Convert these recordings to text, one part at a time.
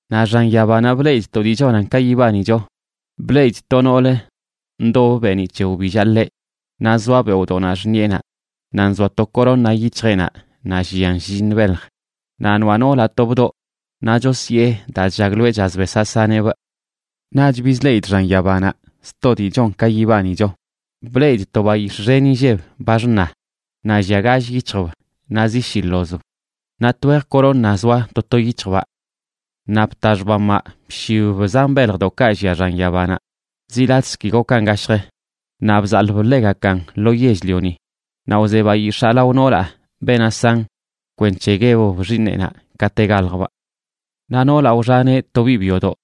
Naꞌ xan yabanaꞌ bleꞌidꞌ to dii chonan ka yibanicho. Bleꞌidꞌ to nool ndobə beeniꞌ c̱he wbillaꞌ ḻeꞌ, naꞌ zoa beoꞌdoꞌnaꞌ xṉiꞌenaꞌ, naꞌ nzoa to corona yic̱hjeꞌnaꞌ naꞌ llian shlliṉ belj. Naꞌ noaꞌ noolaꞌ to bdoꞌ, naꞌ chosyee daa chllagloeꞌ chaz besaꞌ saneꞌbꞌ. Naꞌch bizleꞌidꞌ xan yabanaꞌ sto dii chon ka yibanicho. Bleꞌidꞌ to bayix̱ꞌ xen inlleb, ba xṉa, naꞌ llia gall yic̱hjb naꞌ zi shi ḻozb, naꞌ twej corona zoa to to yic̱hjbaꞌ. Naꞌ bta xbamaꞌ bshibb zan beljdoꞌkaꞌ llia xan yabanaꞌ, zi latꞌzə ki gokan gashj,a naꞌ bzaḻꞌb ḻegakan lo yell-lioni. Naꞌ wze bayix̱aa lao noolaꞌ beenaꞌ san, kwenc̱he guebb xiiṉeꞌnaꞌ kate galjbꞌ. Naꞌ noolaꞌ wxaneꞌ to biꞌ byodoꞌ,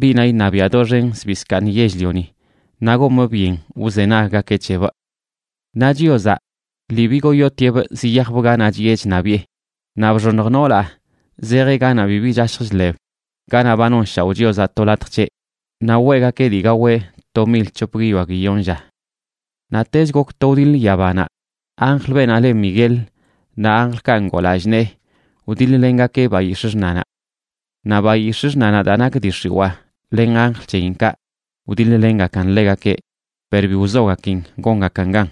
biꞌnaꞌ iṉabiaꞌ doxen zbii zkaaṉ yell-lioni naꞌ gomꞌ byen wzenaggakeꞌ c̱hebꞌ. Naꞌ Chiozaꞌ lii bigoyotieꞌbꞌ ziyajbꞌ ganaꞌ chiꞌe chṉabiꞌe. Naꞌ bxoṉj noolaꞌ zejeꞌ ganaꞌ bibi chashj chḻeb, ganaꞌ ba nonshaoꞌ Chiozaꞌ to latj c̱heꞌ, naꞌ weꞌgakeꞌ dii gaweꞌ to mil c̱hop guiyoa guiyon lla. Naꞌtech gok to wdiḻ yabanaꞌ. Anjl, beenaꞌ le Miguel, naꞌ anjlkaꞌ ngoo lallꞌ nee wdiḻ-lengakeꞌ bayix̱ꞌ xṉanaꞌ. Naꞌ bayix̱ꞌ xṉanaꞌ, daa nak dii x̱iwaa, len anjl c̱heyinkaꞌ wdiḻ-lengakan ḻegakeꞌ, per bi wzogakin gongakan gan.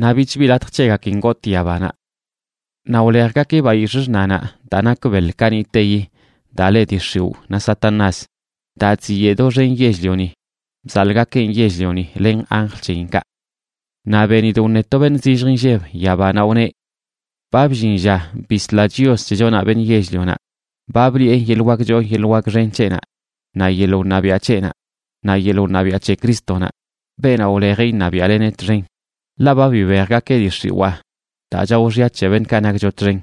Naꞌ bich bi latj c̱hegakin gotꞌ yabanaꞌ. Naꞌ wlejgakeꞌ bayix̱ꞌ xṉanaꞌ, daa nak beḻ kaniꞌteyi, daa le dii x̱iwꞌ naꞌ Satanás, daa chziyeꞌ doxen yell-lioni. Bzaḻꞌgakeꞌn yell-lioni len anjl c̱heyinkaꞌ. Naꞌ benidꞌ wṉe to beṉꞌ zillj inlleb yabanaꞌ, wneꞌ: ―Ba bllin lla bisla Chios c̱hechonaꞌ beṉꞌ yell-lionaꞌ, ba bliꞌe yeḻꞌ wak choo yeḻꞌ wak xen c̱heꞌnaꞌ naꞌ yeḻꞌ wṉabiaꞌ c̱heꞌnaꞌ, naꞌ yeḻꞌ wṉabiaꞌ c̱he Crístonaꞌ, beenaꞌ wlejeꞌ iṉabiaꞌleneꞌ txen. Ḻaꞌ ba bibejgakeꞌ dii x̱iwaa daa chao xya c̱he beṉꞌkaꞌ nakcho txen,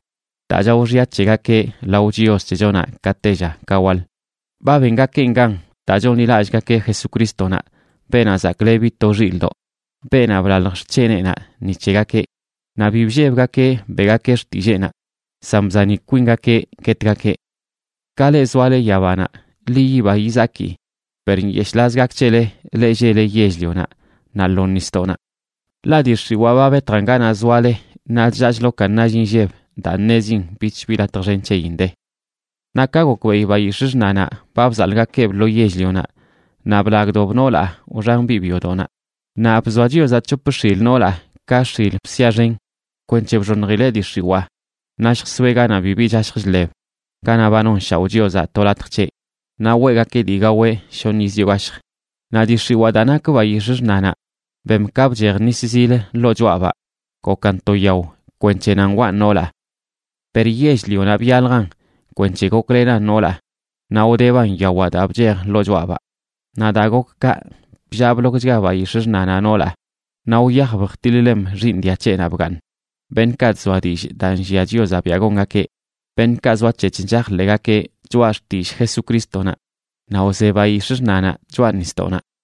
daa chao xya c̱hegakeꞌ lao Chios c̱hechonaꞌ ka tella ka waḻ. Ba bengakeꞌn gan daa chonḻilallꞌgakeꞌ Jesucrístonaꞌ, Beenaꞌ Zaklebi to Xilꞌdoꞌ, beenaꞌ blalj xc̱heneꞌnaꞌ ni c̱hegakeꞌ. Naꞌ bi bllebgakeꞌ beꞌgakeꞌ xtilleenaꞌ, san bzani kwingakeꞌ guetgakeꞌ. ¡Ka leꞌ zoale yabanaꞌ, ḻi yiba yizaki! Per ¡nyeshꞌlaz gak c̱hele, leꞌ lleꞌle yell-lionaꞌ naꞌ lo nisdoꞌnaꞌ! Ḻaꞌ dii x̱iwaa ba betjan ganaꞌ zoale naꞌ chllaa chlokan nall inlleb daa ṉezin bich bi latj xen c̱heyin de. Naꞌ ka gokbeꞌi bayix̱ꞌ xṉanaꞌ ba bzaḻꞌgakeꞌb lo yell-lionaꞌ, naꞌ blagdob noolaꞌ wxan biꞌ byodoꞌnaꞌ. Naꞌ bzoa Chiozaꞌ c̱hop x̱il noolaꞌ, ka x̱il bsia xen, kwenc̱he bxoṉjileꞌ dii x̱iwaa naꞌ lljsoeꞌ ganaꞌ bibi chashj chḻeb, ganaꞌ ba nonshaoꞌ Chiozaꞌ to latj c̱heꞌ, naꞌ weꞌgakeꞌ dii gaweꞌ shoṉ yiz yoo gashjə. Naꞌ dii x̱iwaa, daa nak bayix̱ꞌ xṉanaꞌ, bem ka bchej nis zil ḻoo choꞌabaꞌ gokan to yao kwenc̱he nan waꞌn noolaꞌ. Per yell-lionaꞌ byaljan kwenc̱he goklenan noolaꞌ, naꞌ wdeban yawaꞌ daa bchej ḻoo choꞌabaꞌ. Naꞌ daa gok kaꞌ, bllaa blokchga bayix̱ꞌ xṉanaꞌ noolaꞌ naꞌ wyajb jtiḻ-lem xiiṉ dia c̱heꞌnaꞌ bgaaṉ, beṉꞌkaꞌ chzoa dillꞌ daa nllia Chiozaꞌ biaꞌ gongakeꞌ, beṉꞌkaꞌ zoac̱hec̱h chajḻeꞌgakeꞌ choꞌa xtillꞌ Jesucrístonaꞌ. Naꞌ wze bayix̱ꞌ xṉanaꞌ choꞌa nisdoꞌnaꞌ.